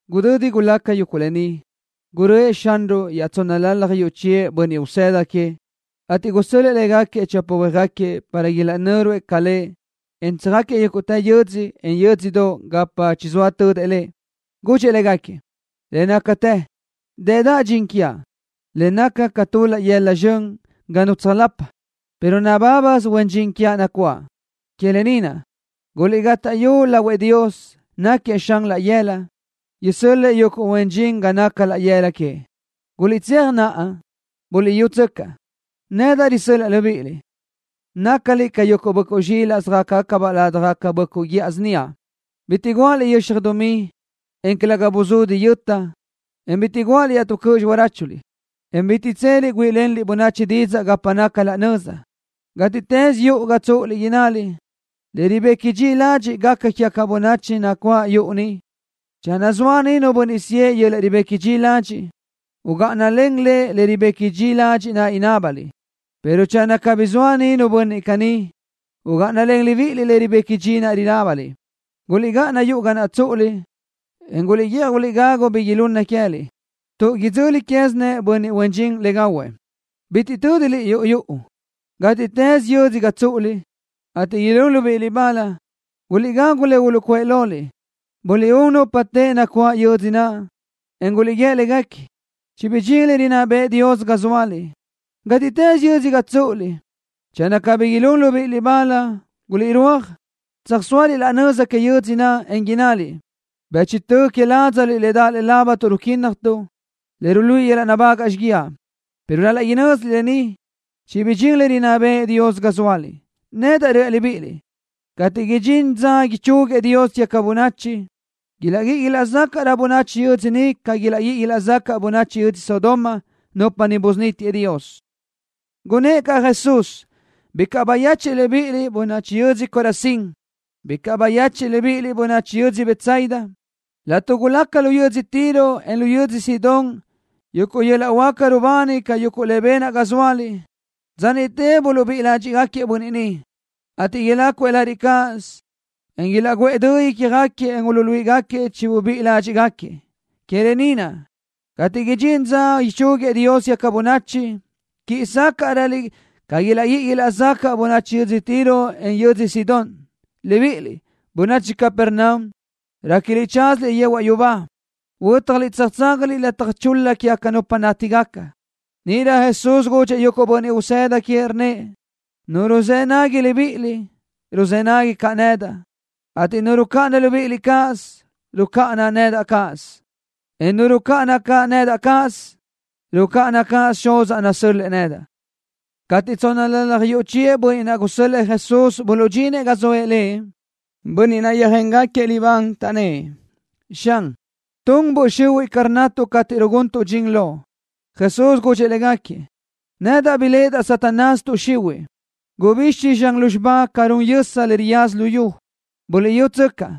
Gudödi gulaca yuguʼ lë ni, gurö́ëʼ Xanruʼ iaʼtsónnalalaj yuʼ chiëʼ bönniʼ usëda queëʼ, ateʼ gusö́l-lëʼë légaquiëʼ chopa huéajgaquiëʼ para ilaʼnö́ruëʼ ca Lëʼ, en tsöjáquiëʼ yúguʼtë yödzö, en yö́dzödoʼ gapa chizóa tödëʼ Lëʼ. Gudxëʼ légaquiëʼ: —Le nácatë, dëdaʼ dxin quiaʼ, le naca ca tu laʼ yëla zxön ga nu tsöjlapaʼ, pero nabábasö huen dxin quiaʼ nacuáʼ. Que lë ni naʼ, guliʼgátaʼyu lahuëʼ Dios, náquiëʼ Xan laʼ yëla naʼ, isö́l-lëʼë yuguʼ huen dxin ga naca laʼ yëla queëʼ. Guliʼtséaj naʼa. Buliʼyútsöcaʼ, nedaʼ risö́l-laʼa libíʼiliʼ, nácaliʼ ca yuguʼ böʼcuʼ zxilaʼ söjácabaʼ ládjagacabaʼ böʼcuʼ guíʼa síniaʼ. Bitiʼ guáʼaliʼ yöxaj dumí, en calëga buzudi yöta, en bitiʼ guáʼaliʼ iaʼtú cöʼ xiráchuliʼ, en bitiʼ tseliʼ para güíʼilenliʼ bönachi didzaʼ gapa naca laʼ nöza. Gátiʼtës yuʼu ga tsúʼuliʼ, innaliʼ: “Le ribequi dxi ladxiʼ gaca quégaca bönachi nacuáʼ yuʼu ni.” Channö zoa niʼ nu bönniʼ siʼë yöl-laʼ ribequi dxi ladxiʼ, ugáʼanalen lëʼ le ribequi dxi ladxiʼ naʼ inábaliʼ, pero channö cabí zoa niʼ nu bönniʼ caní, ugáʼanalen libíʼiliʼ le ribequi dxi ladxiʼ naʼ inábaliʼ. Guliʼgáʼana yuʼu ga naʼ tsúʼuliʼ, en guliʼguíʼaj guliʼgagu bi ilunnëʼ queë́liʼ, tuʼ udzöli quézinëʼ bönniʼ huen dxin le gahuëʼ. Bitiʼ tö́diliʼ yuʼu yuʼu. Gátiʼtës yödzö ga tsúʼuliʼ, ateʼ ilún libíʼiliʼ bal, guliʼgagu le uluʼcuʼë loliʼ. Buliʼún nupa teʼe nacuáʼ yödzö naʼ, en guliʼguíë léguequi: “Chibidxín le rinná bëʼë Dios ga zóaliʼ.” Gátiʼtës yödzö ga tsúʼuliʼ, channö cabí ilún libíʼiliʼ bal, guliʼrúaj, tsöjsóaliʼ laʼ nöza que yödzö naʼ, en innaliʼ: “Bëchtö que ládzaliʼ le daʼ lëʼe lábatuʼ ruquínnajtuʼ, le ruluíʼi nabágaʼliʼ xíguiaʼ, pero ral-laʼ inö́ziliʼ lë ni, chibidxín le rinná bëʼë Dios ga zóaliʼ.” Nedaʼ reaʼ libíʼiliʼ, cateʼ idxín dza ichúguiëʼ Dios quégaca bönachi, ilaʼguíʼi ilaʼzacaʼrö bönachi yödzö niʼ ca ilaʼguíʼi ilaʼzacaʼ bönachi yödzö Sodoma, nupa niʼ busunítiëʼ Dios. Gunnë́ʼ caʼ Jesús: —Bicaʼ bayechiʼ libíʼiliʼ, bönachi yödzö Corazín. Bicaʼ bayechiʼ libíʼiliʼ, bönachi yödzö Betsaida. Laʼtuʼ gulaca lu yödzö Tiro, en lu yödzö Sidón yuguʼ yöl-laʼ huáca rubani ca yuguʼ le benaʼ ga zóaliʼ, dza niʼte uluʼbíʼi ládxiʼgaquiëʼ bönniʼ niʼ, ateʼ ilácuëʼ lariʼ cáʼasö, en ilaʼguʼë dö ícjagaquiëʼ, le uluíʼigaca chibuluʼbíʼi ládxiʼgaquiëʼ. Que lë ni naʼ, cateʼ idxín dza ichúguiëʼ Dios quégaca bönachi, quíʼi sácaʼröliʼ ca ilaʼguíʼi ilaʼzáquiëʼ bönniʼ yödz Tiro, en yödz Sidón. Libíʼiliʼ, bönachi Capernaum. Réquiliʼ tsázaliʼ yehuaʼ yubá. Huö́tjaliʼ tsöjtsázaliʼ lataj chul-la quégaca nupa nátigaca. Níʼirö Jesús gudxëʼ yuguʼ bönniʼ usëda queëʼ, rnnëʼ: —Nu ruzë́ nagui libíʼiliʼ, ruzë́ nagui caʼ nedaʼ, ateʼ nu rucáʼana libíʼiliʼ cáʼasö, rucáʼana caʼ nedaʼ cáʼasö, en nu rucáʼana nedaʼ cáʼasö, rucáʼana caʼ cáʼasö Xuzaʼ, nasö́l-lëʼë nedaʼ. Cateʼ tsónnalalaj yuʼ chiëʼ bönniʼ naʼ gusö́l-lëʼë Jesús buluʼdxinëʼ ga zoëʼ Lëʼ, bönniʼ naʼ yöjéngaquiëʼ libán, taʼnnë́ʼ: —Xan, tun böʼ xihuiʼ ca rnnatuʼ cateʼ ruguntuʼ dxin Loʼ. Jesús gudxëʼ légaquiëʼ: —Nedaʼ biléʼedaʼ Satanás tuʼ xihuiʼ, gubixi zxan lúzxiba ca run yösa, le riyaza luyú. Buliʼyútsöcaʼ,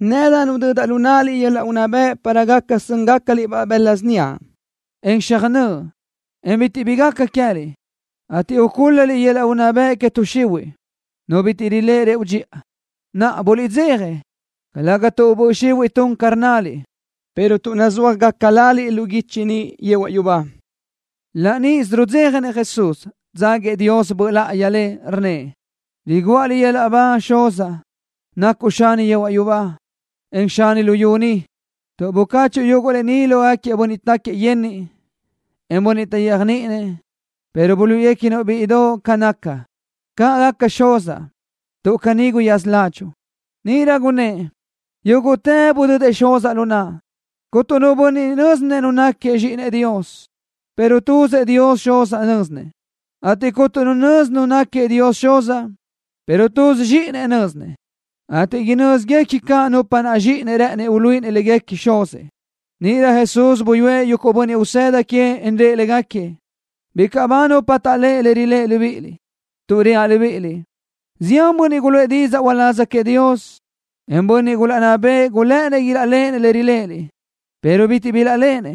nedaʼ nudödaʼ lu náʼaliʼ yöl-laʼ unná bëʼ para gaca sö́ngacaliʼ-baʼ bëla síniaʼ, en xöjnö́ʼ, en bitiʼ bi gaca queë́liʼ, ateʼ ucúl-laliʼ yöl-laʼ unná bëʼ que tuʼ xihuiʼ, nu bitiʼ riléʼe rëʼu dxiʼa. Naʼa, buliʼdzeja, calë́gasö tuʼ tun böʼ xihuiʼ ca rnnaliʼ, pero tuʼ nuzúajgaca laliʼ lu guichi niʼ yehuaʼ yubá. Laʼ níʼisö rudzéjanëʼ Jesús, dzáguiëʼ Dios Böʼ Láʼayi Lëʼ, rnnëʼ: —Riguʼa Liʼ yöl-laʼ ba, Xuzaʼ, nacuʼ Xani yehuaʼ yubá, en Xani luyú ni, tuʼ bucáchuʼu yuguʼ lë ni lógaquiëʼ bönniʼ táquiëʼ yenniʼ, en bönniʼ taʼyéajniʼinëʼ, pero buluíʼiguequinuʼ-biʼ bíʼidoʼ ca naca. ¡Caʼ gaca, Xuzaʼ, tuʼ caní guyaza ládxuʼu! Níʼirö gunnë́ʼ: —Yúguʼtë budödëʼ Xuzaʼ lu naʼa. Cuntu nu bönniʼ nö́zinëʼ Nu náquiëʼ Zxíʼinëʼ Dios, pero tuzëʼ Dios Xuz nö́zinëʼ, ateʼ cuntu nu nözi Nu náquiëʼ Dios Xuz, pero tuzëʼ Zxíʼinëʼ nö́zinëʼ, ateʼ inö́zigaca caʼ nupa naʼ Zxíʼinëʼ rë́ʼënëʼ uluíʼinëʼ léguequi Xuzëʼ. Níʼirö Jesús buyúëʼ yuguʼ bönniʼ usëda queëʼ, en rëʼ légaquiëʼ: —Bicaʼ bágaca nupa taʼléʼe le riléʼeliʼ libíʼiliʼ, tuʼ reaʼ libíʼiliʼ: Zián bönniʼ guluʼë didzaʼ uláz queëʼ Dios, encaʼ bönniʼ gulaʼnná bëʼë, gulë́ʼënnëʼ ilaʼléʼenëʼ le riléʼeliʼ, pero bitiʼ bilaʼléʼenëʼ le.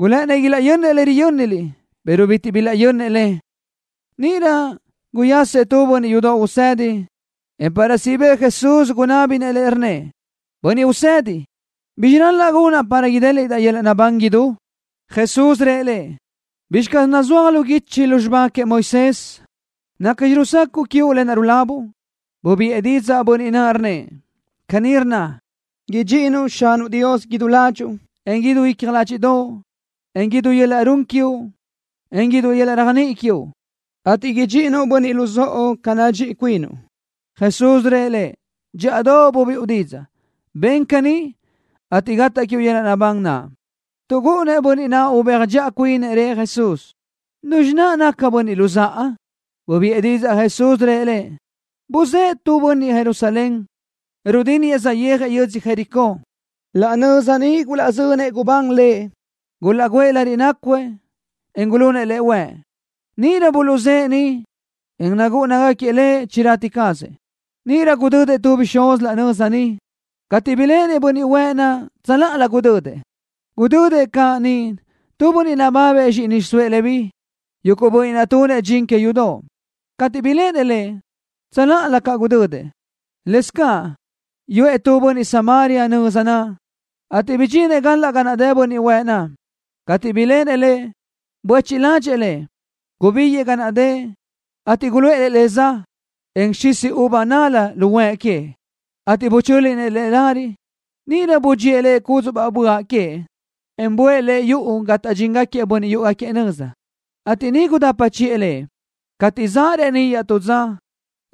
Gulë́ʼënnëʼ ilaʼyönnëʼ le riyö́niliʼ, pero bitiʼ bilaʼyönnëʼ le. Níʼirö guyasëʼ tu bönniʼ yudoʼ usedi, en para siʼ bëʼë Jesús, gunábinëʼ Lëʼ, rnnëʼ: —Bönniʼ Usedi, ¿bizxi ral-laʼ gunaʼ para idéliʼdaʼ yöl-laʼ naʼbán idú? Jesús rëʼ lëʼ: —¿Bizxi caz nazúaj lu guichi lu xibá queëʼ Moisés? ¿Nacxi rusacaʼ quiuʼ lë naʼ rulabuʼ? Bubiʼë didzaʼ bönniʼ naʼ, rnnëʼ: —Caní rnna: “Idxíʼinuʼ Xanuʼ Dios idú ládxuʼu, en len idú icja ládxiʼdoʼo, en len idú yöl-laʼ run quiuʼ, en len idú yöl-laʼ réajniʼi quiuʼ, ateʼ idxíʼinuʼ bönniʼ luzóʼo ca nadxíʼi cuinuʼ.” Jesús rëʼ lëʼ: —Dxíʼadoʼ bubiʼu didzaʼ. Ben caní, ateʼ gataʼ quiuʼ yöl-laʼ naʼbán naʼ. Tuʼ gúʼunnëʼ bönniʼ naʼ ubéaj dxiʼa cuinëʼ, rëʼ Jesús: —¿Nuzxi naʼ bönniʼ luzáʼa? Bubiʼë didzaʼ Jesús, rëʼ lëʼ: —Buzë́ʼë tu bönniʼ Jerusalén, rudínniëʼ, saʼyéajëʼ yödzö Jericó. Laʼ nöza niʼ gulaʼzönëʼ gubán lëʼ. Gulaʼgúëʼ lariʼ nácuëʼ, en gulunëʼ lëʼ huëʼ. Níʼirö buluʼzë́ʼë niʼ, en nucáʼanagaquiëʼ lëʼ, chirati cazëʼ. Níʼirö gudödëʼ tu bixúz laʼ nöza niʼ. Cateʼ biléʼenëʼ bönniʼ huëʼ naʼ, tsöláʼalö gudödëʼ. Gudödëʼ caʼ niʼ tu bönniʼ nababëʼ zxíʼini xiʼsóëʼ Leví, yuguʼ bönniʼ naʼ tunëʼ dxin que yudoʼ. Cateʼ biléʼenëʼ lëʼ, tsöláʼalö caʼ gudödëʼ. Lëscaʼ yuʼë tu bönniʼ Samaria nöza naʼ, ateʼ bidxinëʼ galaʼ ga dëʼ bönniʼ huëʼ naʼ. Cateʼ biléʼenëʼ lëʼ, buéchiʼ ládxëʼë lëʼ. Gubíguiʼë ga naʼ dëʼ, ateʼ guluʼë le za, en xisi uva nál-la lu huëʼ queëʼ, ateʼ buchö́linëʼ le lariʼ. Níʼirö budxíëʼ lëʼ cúdzuʼbaʼ böaʼ queëʼ, en buʼë lëʼ yuʼu ga taʼdxinëʼ bönniʼ yúʼugaquiëʼ nöza, ateʼ niʼ gudapa chiʼë lëʼ. Cateʼ zaʼ reníʼ iaʼtú dza,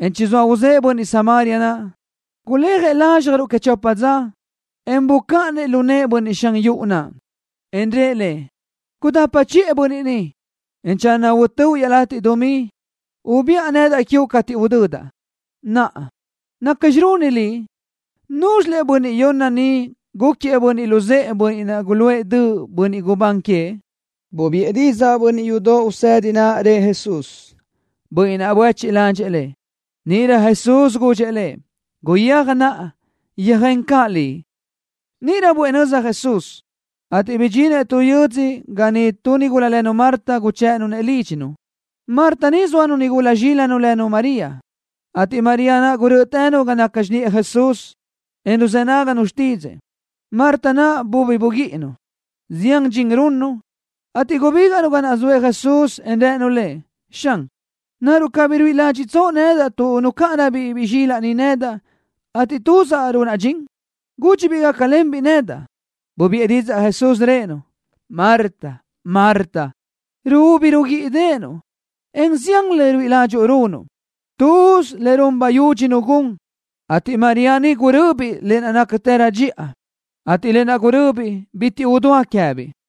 en chizóa uzë́ʼë bönniʼ Samaria naʼ, guléajëʼ lázxjaruʼ que chopa dza, le bucáʼanëʼ lu nëʼë bönniʼ xan yuʼu naʼ, en rëʼ lëʼ: “Gudapa chiʼë bönniʼ ni, en channö utö́uʼ iaʼlatiʼ dumí, ubiʼa nedaʼ quiuʼ cateʼ huödaʼ.” Naʼa, ¿nacxi runi liʼ? ¿Núzxilëʼ bönniʼ yonna ni gúquiëʼ bönniʼ luzë́ʼë bönniʼ naʼ guluʼë döʼ bönniʼ gubán queëʼ? Bubiʼë didzaʼ bönniʼ yudoʼ usedi naʼ, rëʼ Jesús: —Bönniʼ naʼ buéchiʼ ládxëʼë lëʼ. Níʼirö Jesús gudxëʼ lëʼ: —Guyéaj naʼa, yöjén caʼ liʼ. Níʼirö buʼë nöza Jesús, ateʼ bidxinëʼ tu yö́dzödoʼ ga niʼ tu nigula lënu Marta guchë́ʼënu Lëʼ lídxinu. Marta ni zóanu nigula zxílanu lënu María, ateʼ María naʼ gurö́ʼötënu ga naca xiniʼë Jesús, en ruzë́ náganu xtídzëʼë. Marta naʼ bubi buguíʼinu, zián dxin runnu, ateʼ gubígaʼnu ga naʼ zoëʼ Jesús, en rënu Lëʼ: —Xan, ¿naruʼ cabí ruíʼi ládxiʼtsoʼ nedaʼ tuʼ nucáʼanabiʼ biʼi zxilaʼ ni nedaʼ, ateʼ tuzaʼ runaʼ dxin? Gudxi-biʼ gácalenbiʼ nedaʼ. Bubiʼë didzaʼ Jesús, rëʼë-nu: —Marta, Marta, ruúbi ruguíʼideʼenuʼ, en zián le ruíʼi ládxuʼu runuʼ. Tuz le run bayudxi nu gun, ateʼ María ni guröbiʼ lë naʼ nácatërö dxiʼa, ateʼ lë naʼ guröbiʼ bitiʼ udúa queë́biʼ.